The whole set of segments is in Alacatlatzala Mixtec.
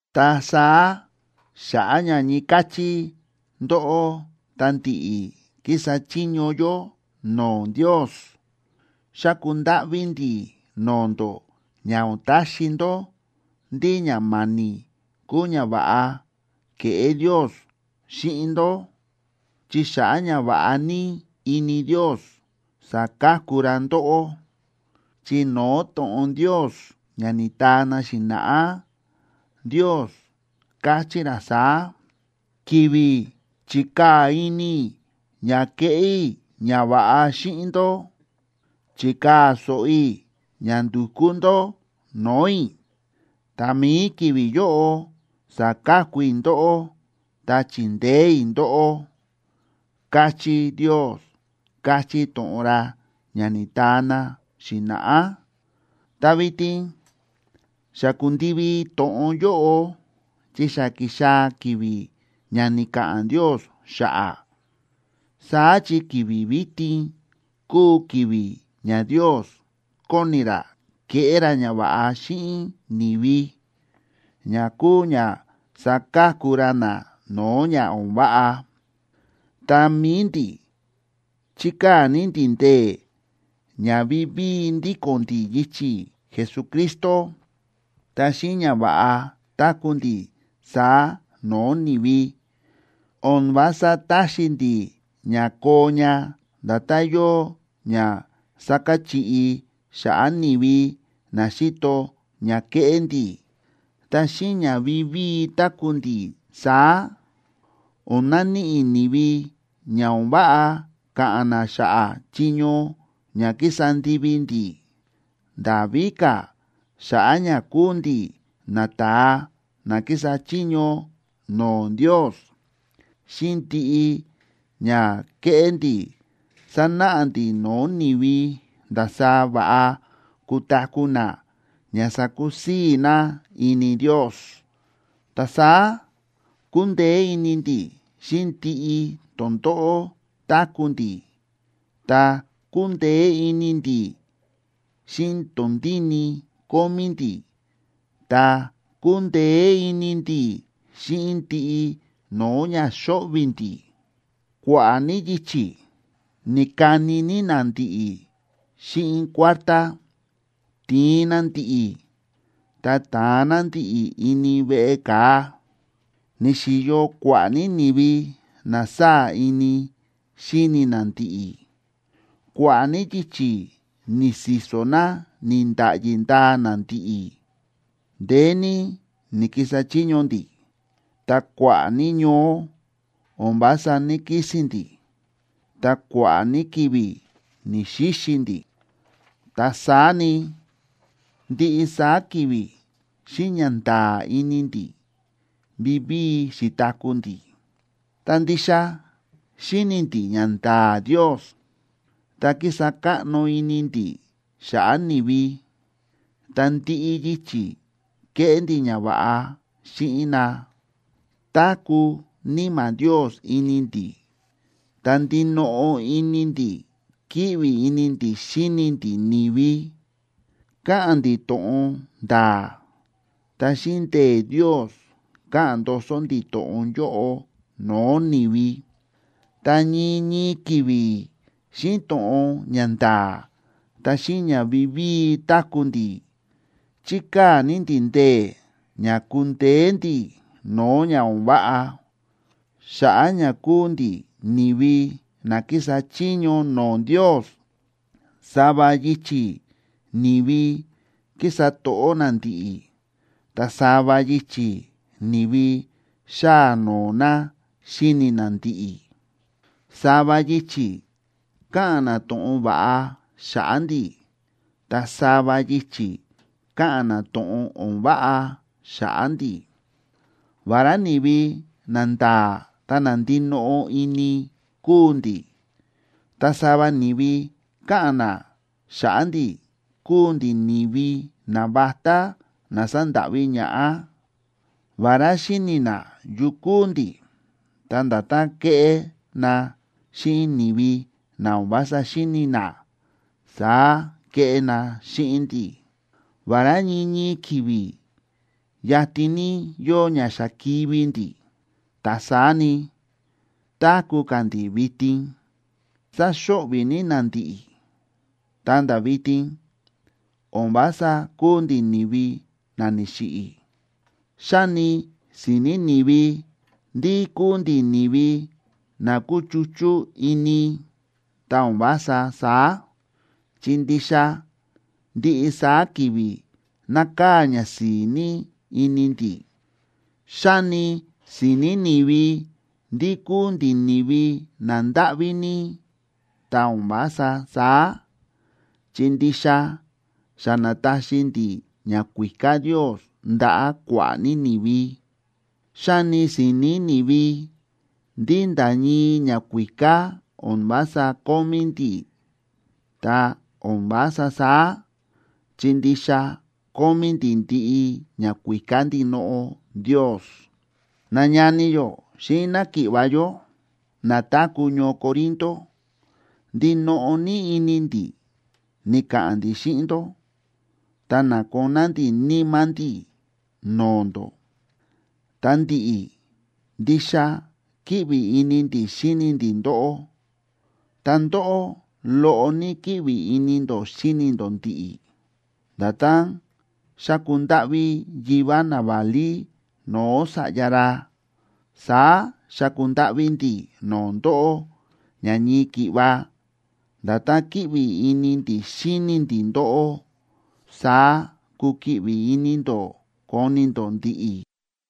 Ta saá, xa̱ꞌa̱ ña ñii káchí ndóꞌó ta ndi̱ꞌi̱ kísa chiño yó no̱o̱ Ndios, xáku ndáꞌví ndi̱ no̱o̱ ndó ña o̱n taxi ndó ndí ña ma̱ni̱ kuu ñava̱ꞌa ke̱ꞌé Ndios xíꞌin ndó, chi xa̱ꞌa̱ ñava̱ꞌa ní ini Ndios, sa̱ka̱ku ra ndóꞌó. Chi no̱o̱ to̱ꞌon Ndios ña ni̱taa na xi̱na̱ꞌá, Ndios káchí ra saá: Ki̱vi̱ chi̱kaa̱ ini i̱ ña keꞌé i̱ ñava̱ꞌa xíꞌin ndó, chi̱kaa̱ so̱ꞌo i̱ ña ndu̱kú ndó no̱o̱ i̱; ta mi̱i ki̱vi̱ yóꞌo sa̱ka̱ku i̱ ndóꞌó, ta chi̱ndeé i̱ ndóꞌó, káchí Ndios, káchí to̱ꞌon ra ña ni̱taa na xi̱na̱ꞌá. Ta vitin xa ku̱ndivi to̱ꞌon yóꞌo, chi xa ki̱xaa̱ ki̱vi̱ ña ni̱ka̱ꞌa̱n Ndios xa̱ꞌa̱. Saá chi ki̱vi̱ vitin kúu ki̱vi̱ ña Ndios kóni ra keꞌé ra ñava̱ꞌa xíꞌin ni̱vi, ña kúu ña saka̱ku ra na no̱o̱ ña o̱n váꞌa. Ta mi̱i ndi̱ chíkaa̱ ní ndi̱ ndee̱ ña vivíi ndíko̱n ndi̱ yichi̱ Jesucristo. Ta xíꞌin ña va̱ꞌa táku̱ ndi̱ saá no̱o̱ ni̱vi, o̱n vása táxi ndi̱ ña koo ña nda̱tán yóo ña sákachiꞌi xa̱ꞌa̱ ni̱vi na xíto ña kéꞌé ndi̱. Ta xíꞌin ña vivíi táku̱ ndi̱ saá, o̱n naníꞌi ni̱vi ña o̱n váꞌa ka̱ꞌa̱n na xa̱ꞌa̱ chiño ña kísa ndivi ndi̱. Nda̱ víka̱, xa̱ꞌa̱ ña kúu ndi̱ nata̱a na kísa chiño no̱o̱ Ndios, xíꞌin ndiꞌi ña kéꞌé ndi̱ sánáꞌa ndi̱ no̱o̱ ni̱vi ndasaá va̱ꞌa kutaku̱ na ña sakusii̱ na ini Ndios. Ta saá kúndeé ini ndi̱ xíꞌin ndiꞌi tondóꞌó táku̱ ndi̱, ta kúndeé ini ndi̱ xíꞌin tondíni kómí ndi̱ ta kúndeé ini ndi̱ xíꞌin ndiꞌi no̱o̱ ña xóꞌvi̱ ndi̱. Kua̱ꞌa̱ ní yichi̱ ni̱kani ní na ndi̱ꞌi̱ xíꞌin kuártá, ti̱in na ndi̱ꞌi̱, ta ta̱an na ndi̱ꞌi̱ ini veꞌe ka̱a. Ni̱xi̱yo kua̱ꞌa̱ ní ni̱vi na sáa̱ ini xíni na ndi̱ꞌi̱, kua̱ꞌa̱ ní yichi̱ ni̱si̱so̱ na ni̱nda̱ꞌyi ndaa na ndi̱ꞌi̱. Ndeé ní ni̱kisa chiño ndi̱, ta kua̱ꞌa̱ ní ñoó o̱n vása ní‑kisi̱n ndi̱, ta kua̱ꞌa̱ ní ki̱vi̱ ni̱‑xixi ndi̱. Ta saá ni, ndiꞌi saá ki̱vi̱ xíꞌin ñanda̱a̱ ini ndi̱ vivíi xi̱taku̱ ndi̱. Ta ndixa xíni̱ ndi̱ ñanda̱a̱ Ndios, ta kísa káꞌno ini ndi̱ xa̱ꞌa̱ ni̱vi, ta ndiꞌi yichi̱ kéꞌé ndi̱ ñava̱ꞌa xíꞌin na. Táku̱ Níma̱ Ndios ini ndi̱, ta ndinoꞌo ini ndi̱ kíꞌvi ini ndi̱ xíni ndi̱ ni̱vi. Káꞌa̱n ndi̱ to̱ꞌon nda̱a̱, ta xíꞌin ndee̱ Ndios káꞌa̱n ndoso ndi̱ to̱ꞌon yóꞌo no̱o̱ ni̱vi. Ta ñii ñii ki̱vi̱ xíꞌin to̱ꞌon ña nda̱a̱ ta xíꞌin ña vivíi táku̱ ndi̱, chíkaa̱ ní ndi̱ ndee̱ ña kundeé ndi̱ no̱o̱ ña o̱n váꞌa. Xa̱ꞌa̱ ña kúu ndi̱ ni̱vi na kísa chiño no̱o̱ Ndios, sava yichi̱ ni̱vi kísa to̱ꞌó na ndi̱ꞌi̱, ta sava yichi̱ ni̱vi xáa noo na xíni na ndi̱ꞌi̱. Sava yichi̱ káꞌa̱n na to̱ꞌon va̱ꞌa xa̱ꞌa̱ ndi̱, ta sava yichi̱ káꞌa̱n na to̱ꞌon o̱n váꞌa xa̱ꞌa̱ ndi̱. Vará ni̱vi nanda̱a̱ ta na ndinoꞌo ini kúu ndi̱, ta sava ni̱vi káꞌa̱n na xa̱ꞌa̱ ndi̱ kúu ndi̱ ni̱vi navatá na sándáꞌví ñaꞌá. Vará xíni̱ na yu kúu ndi̱, ta nda̱tán kéꞌé na xíꞌin ni̱vi na o̱n vása xíni̱ na, saá kéꞌé na xíꞌin ndi̱. Vará ñii ñii ki̱vi̱ yatin ní yóo ña xa kivi̱ ndi̱, ta saá ni, táku̱ ka̱ ndi̱ vitin. Sáxo̱ꞌvi̱ ní na ndi̱ꞌi̱, ta̱nda̱ vitin, o̱n vása kúu ndi̱ ni̱vi na ni̱xiꞌi̱. Xáni si̱ni̱ ni̱vi ndí kúu ndi̱ ni̱vi na kúchuchú ini, ta o̱n vása saá, chi ndixa ndiꞌi saá ki̱vi̱ nákaa̱ ñasi̱i̱ ní ini ndi̱. Xáni si̱ni̱ ni̱vi ndí kúu ndi̱ ni̱vi nandáꞌví ní, ta o̱n vása saá, chi ndixa xa na̱taxi ndi̱ ñakuíká Ndios ndaꞌa̱ kua̱ꞌa̱ ní ni̱vi. Xáni si̱ni̱ ni̱vi ndí nda̱ ñii ñakuíká o̱n vása kómí ndi̱, ta o̱n vása saá, chi ndixa kómí ndi̱ ndiꞌi ñakuíká ndinoꞌo Ndios. Nañani yó xíꞌin náki̱ꞌva̱ yó, na táku̱ ñoo Corinto, ndinoꞌo ní ini ndi̱ ni̱ka̱ꞌa̱n ndi̱ xíꞌin ndó, ta na̱koná ndi̱ níma̱ ndi̱ no̱o̱ ndó. Ta ndi̱ꞌi̱, ndixa kíꞌvi ini ndi̱ xíni ndi̱ ndóꞌó, ta ndóꞌó, loꞌo ní kíꞌvi ini ndó xíni ndó ndi̱ꞌi̱. Nda̱tán xáku ndáꞌví yivá naválí no̱o̱ sa̱ꞌya ra, saá xáku ndáꞌví ndi̱ no̱o̱ ndóꞌó ña ñii ki̱ꞌva nda̱tán kíꞌvi ini ndi̱ xíni ndi̱ ndóꞌó, saá kukiꞌvi ini ndó koni ndó ndi̱ꞌi̱.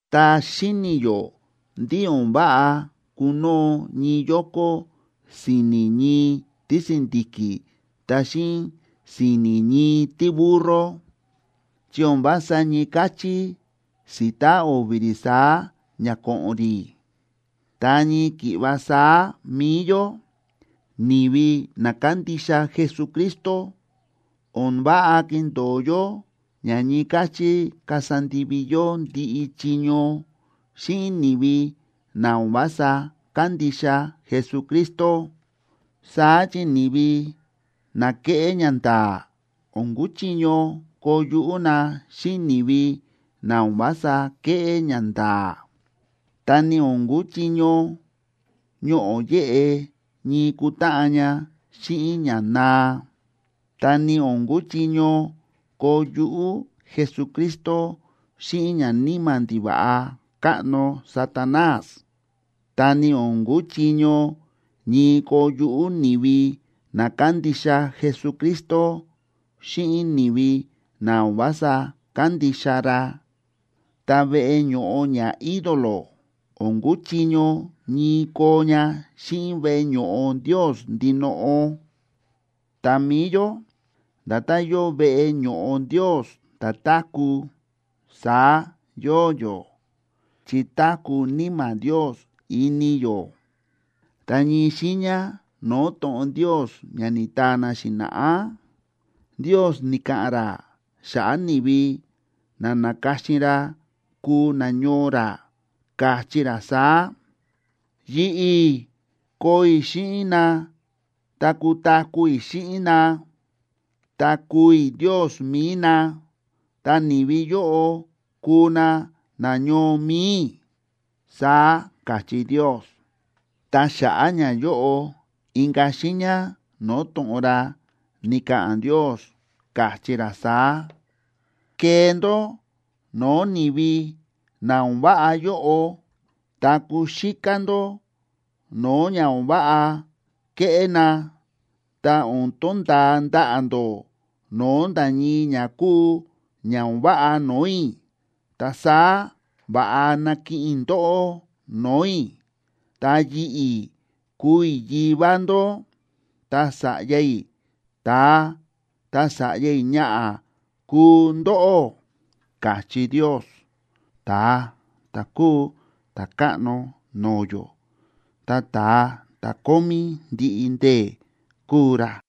Ta xíni̱ yó ndí o̱n váꞌa kunoo ñii yoko si̱ni̱ ñii tísi̱ndi̱ki̱ ta xíꞌin si̱ni̱ ñii tíburro, chi o̱n vása ñii káchí si̱ta o̱vi̱ rí saá ña ko̱ꞌo̱n rí. Ta ñii ki̱ꞌva saá mi̱i yó, ni̱vi na kándixa Jesucristo, o̱n váꞌa kindo̱o yó ña ñii káchí kasa ndivi yó ndiꞌi chiño xíꞌin ni̱vi na o̱n vása kándixa Jesucristo. Saá chi ni̱vi na kéꞌé ñanda̱a̱ o̱n kuchiño koo yuꞌú na xíꞌin ni̱vi na o̱n vása kéꞌé ñanda̱a̱. Ta ni o̱n kuchiño ñoꞌo̱ yéꞌe ñii kutáꞌan ña xíꞌin ña naa. Ta ni o̱n kuchiño koo yuꞌú Jesucristo xíꞌin ñaníma̱ ndiva̱ꞌa káꞌno Satanás.a Ta ni o̱n kuchiño ñii koo yuꞌú ni̱vi na kándixa Jesucristo xíꞌin ni̱vi na o̱n vása kándixa ra. Ta veꞌe ño̱ꞌo ñaídolo o̱n kuchiño ñii koo ña xíꞌin veꞌe ño̱ꞌo Ndios ndinoꞌo. Ta mi̱i yó nda̱tán yóo veꞌe ño̱ꞌo Ndios ta̱táku̱, saá yóo yó, chi táku̱ Níma̱ Ndios ini yó. Ta ñii xiiña no̱o̱ to̱ꞌon Ndios ña ni̱taa na xi̱na̱ꞌá, Ndios ni̱ka̱ꞌa̱n ra xa̱ꞌa̱ ni̱vi na na̱ka̱xin ra kuu nañoo ra, káchí ra saá: Yi̱ꞌi̱ koo i̱ xíꞌin na ta kutaku̱ i̱ xíꞌin na; ta kuu i̱ Ndios mi̱i na, ta ni̱vi yóꞌo kuu na nañoo mi̱i i̱, saá káchí Ndios. Ta xa̱ꞌa̱ ñayóꞌo inka̱ xiiña no̱o̱ to̱ꞌon ra, ni̱ka̱ꞌa̱n Ndios, káchí ra saá: Kee ndó no̱o̱ ni̱vi na o̱n váꞌa yóꞌo, ta kuxíká ndó no̱o̱ ña o̱n váꞌa kéꞌé na; ta o̱n tonda̱a ndaꞌa̱ ndó no̱o̱ nda̱ ñii ña kúu ña o̱n váꞌa no̱o̱ i̱. Ta saá va̱ꞌa nakiꞌin i̱ ndóꞌó no̱o̱ i̱. Ta yi̱ꞌi̱ kuu i̱ Yivá ndó, ta sa̱ꞌya i̱ ta̱a, ta sa̱ꞌya i̱ ñaꞌa̱ kuu ndóꞌó, káchí Ndios, ta̱a ta̱ kúu Ta̱káꞌno no̱o̱ yó, ta ta̱a ta̱ kómí ndiꞌi ndee̱ kúu ra.